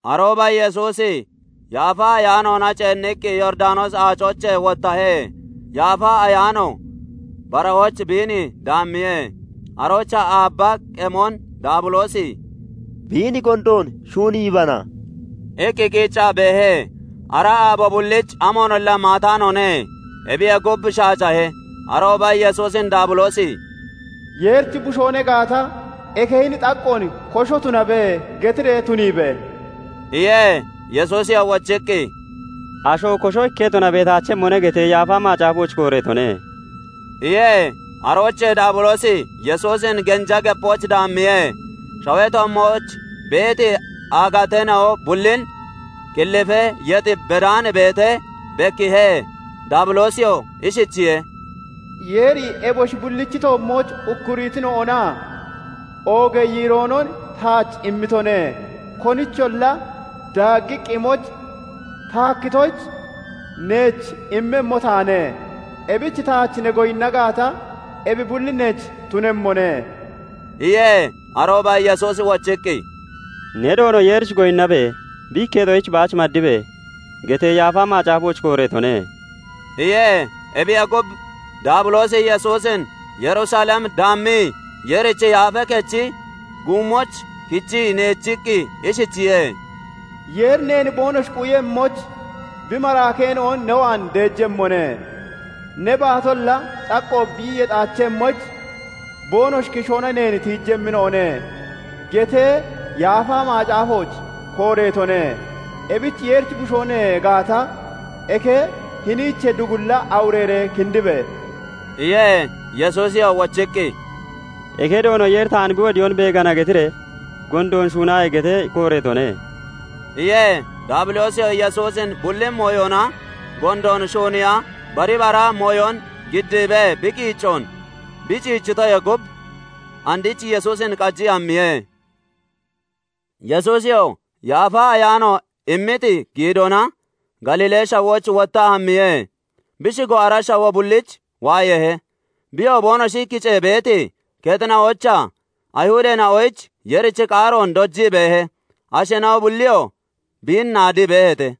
Arooba Yesuusi Yaafa Ayaanoona ceenniqqi Yooridanoosi Aacoochee wottahe; Yaafa Ayaanoo barahooch biin daammiye. Aroochaa aabba qemon Daabiloosi "Biin gondoon shuuniibana" iqqi qiiccaa beehe. Ara aabo bulliich amoonolla maataanoone. Ebiyee gub shaacahe. Arooba Yesuusin Daabiloosi "Yeerichi Bushoo ne gaata, eke hini xaqqoon 'Kosho tunabe!' getiree tuniibe!" iye. Yesuusiyoo wochiqqi, " 'Asho kosho ikketona beetaachemmone' getee Yaafa Macaafooch kooreetone" iye. Aroochee Daabiloosi Yesuusin genja gepooch daammiye; shawee toommooch beeti aagateena'o bullin qillifee yex bedaan beetee bekkiihe. Daabiloosiyoo ishichiye:- "Yeeri eboshi bullichi toommooch ukkurittinoonaa oogee yiiroonon taach immitone; konicholla daaggiqqa imoyich ta hakkitoyich, neech immemmo taane. Ebich taach ne goyinna gaata, ebi bulli neech tunemmone" iye. Arooba Yesuusi wochiqqi, " 'Ne Doono Yeerich goyinnabe! Bi ikketoyich baach maddibe (maddabe)!' gettee Yaafa Macaafooch kooreetone" iye. Ebiyee gub, Daabiloosi Yesuusin Yerusalem daammii, Yeerichi Yaafee Kechi guummooch kichii neechiqqi ishichiye:- " 'Yeeri neen boonoshi quyemmoyich bi maraakeena'on ne waan deejemmone; ne baatolla xaqqo bi yexaachemmoyich boonoshi kishoona neen tiijemmina'one' gettee Yaafa Macaafooch kooreetone; ebich Yeerichi Bushoo ne gaata, eke hiniichee dugulla awureeree kindibe!" iye. Yesuusiyoo wochiqqi, " ' "Eke Doono Yeeri taan bi wodiyoon beegana" getiree gondoon shuunaaye!' gettee kooreetone" iye. Daabiloosiyoo Yesuusin bulli mooyona gondoon shuuniiya, bari bara mooyon giddiibee bi qiiccoon bi ciichitoyee gub, andich Yesuusin qajiqqi hammiye. Yesuusiyoo Yaafa Ayaano immiti giidoona Galiilee shawooch wottaa hammiye. Bi shigo ara shawoo bulliich waayeehe. Biyoo boonoshi kicee beeti kexina'oochaa Ayihudeena'oyich Yeerichi qaaroon dojii beehe; asheena'o bulliyoo biin naadii beeheete.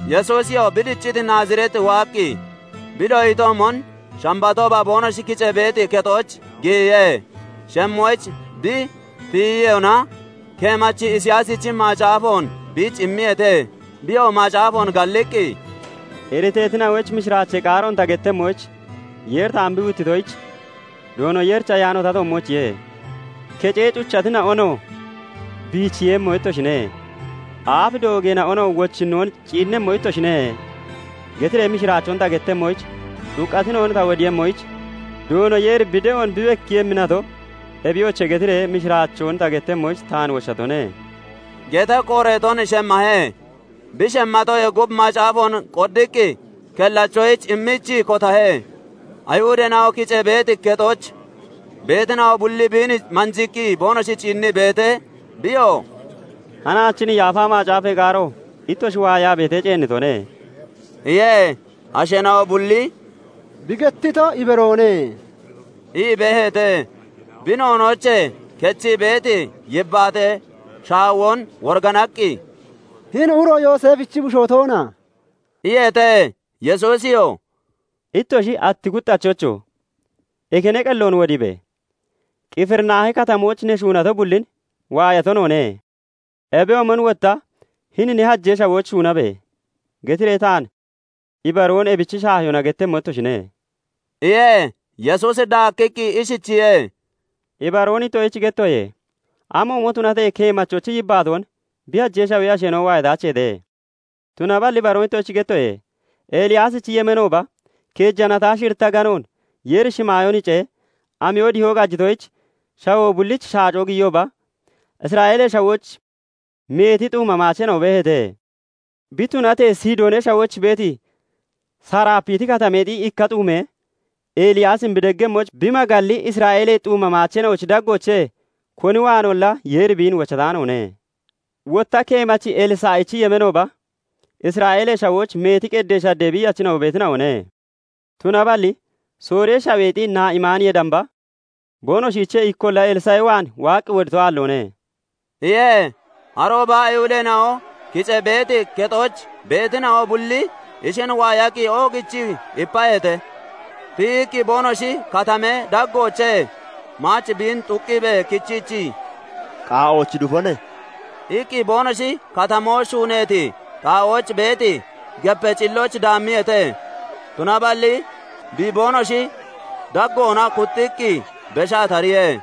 Yesuusiyoo bi dicciti Naazireet waaqqi, bi doyitoomon Shambatooba boonoshi kicee beeti kexooch giyiye; shemmoyich bi tiyiyona, keemachi Isiyaasichi macaafoon biich immiyeete; biyoo macaafoon galliqqi, "Iriteetina'oyich mishiraachee qaaroon ta gettemmoyich Yeeri taan bi huuttitoyich, Doono Yeerichi ayaano ta toommoochiye; kecee cuchatina'onoo 'Biicheeyemmo ittoshine', aaf doogeena'onoo 'Wochinnoon ciinnemmo ittoshine' getiree mishiraachoon ta gettemmoyich, xuqqatina'on ta wodiiyemmoyich, 'Doono Yeeri bi de'oon bi bekkiiyemmi nato, ebiyoche!' getiree mishiraachoon ta gettemmoyich taan wochatone" gettee kooreeton shemmahe. Bi shemmatoyee gub macaafoon qoddiqqi kellachoyich immiichii kotahe. Ayihudeena'o kicee beeti kexooch beetina'o bulli biin manjiiqqi boonoshi ciinnii beetee, biyoo "Hanaach hini Yaafa Macaafee qaaro ittoshi waayaa beetee, ceennitone" iye. Asheena'o bulli "Bi gettito ibaroone" ii beeheete. Bi noonoochee kechii beeti yibbaatee shaawon woriganaqqi, "Hini uro Yooseefichi bushoo toona?" iyeete. Yesuusiyoo "Ittoshi 'Atti kuxxachocho! Eke ne qelloon wodiibe! Qifirinaahi Katamooch ne shuunato bullin waayato noone; ebiyoomon wotta hini ne hajee shawooch shuunabe!' getiree taan ibaroon ebichi shaahiyoona gettemmo ittoshine" iye. Yesuusi daakkiqqi ishichiye:- "Ibaroon ittoshich gettoye; amoomo tunatee keemachochi yibbaatoon bi hajee shawee asheena'o waayataacheete; Tunaballi ibaroon ittoshich gettoye; Eliyaasichi yemeenooba keeja natonaa shiritta aganoonon Yeeri shimaayoon hicee, amiyo dihoo qajitoyich, shawoo bulliich shaacoo giyiyooba, Isra'eelee Shawooch meeti xuuma maacheena'o beeheete. Bi tunatee Sidoonee shawooch beeti Sarapiti Katameexi ikka xuumee Eliyaasin bi deggemmoyich bi magalli, Isra'eelee xuuma maacheena'ochi daggoochee koni waanolla Yeeri biin wochataanoone. Wotta keemachi Elsa'ichi yemeenooba Isra'eelee Shawooch meeti qeddee shaddee biiyachina'o beetina'one; tunaballi Sooriyee shaweexi Na'imaaniyee damba boonoshiichee ikkolla Elsa'i waan waaqqi wodito aalloone" iye. Arooba Ayihudeena'o kicee beeti kexooch beetina'o bulli ishin waayaqqi oogichii ipaheete; Tiyiqqi boonoshi katamee daggoochee maach biin xuqqiibee kichiichii, "Qaa'ooch dufone" iqqi boonoshi katamoo shuuneeti xaa'ooch beeti gepee cillooch daammiyeete. Tunaballi bi boonoshi daggoona kuxxiqqi beshaa tariye.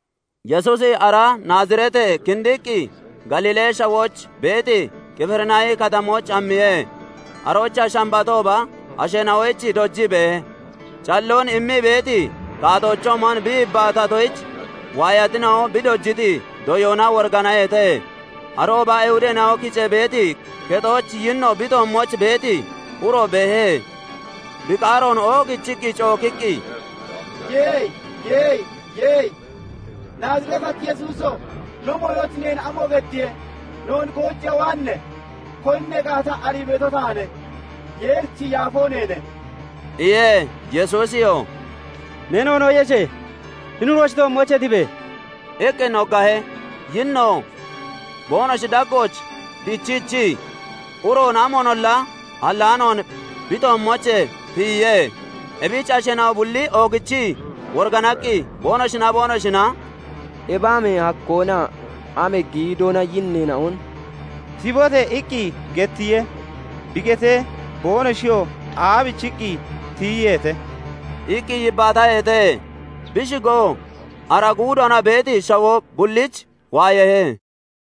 Yesuusi ara Naazireetee kindiqqi Galiilee shawooch beeti Qifirinaahi Katamooch hammiye. Aroochaa Shambatooba asheena'oyich dojii beehe. Calloon immii beeti taatoochoomon bi yibbaatatoyich, waayatina'o bi dojiti doyoona woriganaheete. Arooba Ayihudeena'o kicee beeti kexooch yinno bi toommooch beeti uro beehe. Bi qaaroon oogichii cookiqqi, "Ye! Ye! Ye! Naazireetachi Yesuuso! No mooyooch neen amo geddiye? Noon goojiiya waanne? Koni ne gaata arii beeto taane; Yeerichi Yaafoo neene" iye. Yesuusiyoo "Ne noonoon yeshe! Hini uroochi toommoochee tibe!" iqqi noggahe. Yinnoo boonoshi daggooch dichiichii, uroon amoonolla hallaanoon bi toommoochee tiyiye. Ebich asheena'o bulli oogichii woriganaqqi boonoshinaa boonoshina "Ebi amee hakkoonaa amee giidoona yinneena'on 'Tibote!' iqqi gettiye; bi getee, boonoshiyoo aabichiqqi tiyiyeete?" iqqi yibbaataheete. Bi shigoo ara guudoona beeti shawoo bulliich waayeehe.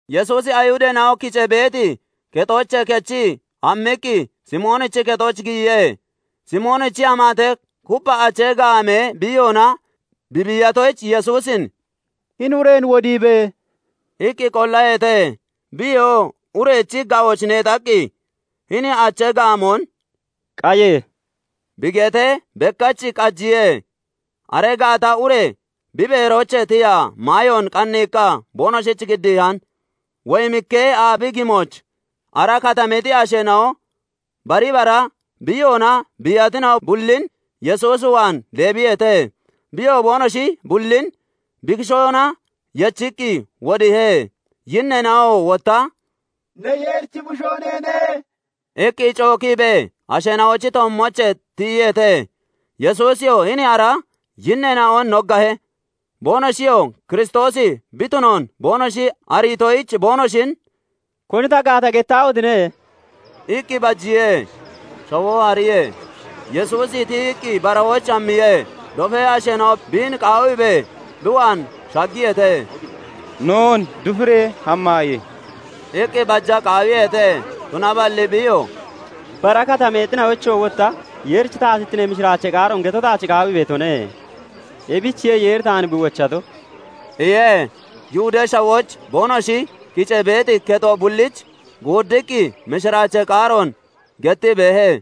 Yesuusi Ayihudeena'o kicee beeti kexoochee kechii hammiqqi Simoonichi kexooch giyiye. Simoonichi amaate kuppha achee gaamee biiyoona bi biiyatoyich, Yesuusin "Hini ureen wodiibe!" iqqi qollaheete. Biyoo urechi ga'ooch neexaqqi, hini achee gaamoon " qaye!" bi getee, bekkach qajiye. Aree gaata ure beeroochee tiyaa maayoon qanniiqqa boonoshich giddiihane. Woyimikee aabi gimooch ara katameexi asheena'o bari bara biiyoona biiyatina'o bullin Yesuus waan deebiyeete. Biyoo boonoshi bullin bi kishoona yechiqqi wodiihe. Yinneena'oo wotta "Ne Yeerichi Bushoo neene!" iqqi cookiibee asheena'ochi toommoochee tiyiyeete. Yesuusiyoo hini ara yinneena'on noggahe; boonoshiyoo Kiristoosi bi tunoon boonoshi ariitoyich, boonoshin "Koni ta gaata, gettaahotine!" iqqi bajiye. Shawoo hariyee, Yesuusi tiyiqqi barahooch hammiye. Dofee asheena'oo biin qaawiibee bi waan shaggiyeete. "Noon dufiree hammaaye!" iqqi baja qaawiyeete. Tunaballi biyoo "Bara katameena'oochoo wotta Yeerichi taatittinee mishiraachee qaaroon geto taach qaawii beetone; ebichiye Yeeri taan bi wochato" iye. Yihudee Shawooch boonoshi kicee beeti kexo bulliich guuddiqqi mishiraachee qaaroon gettii beehe.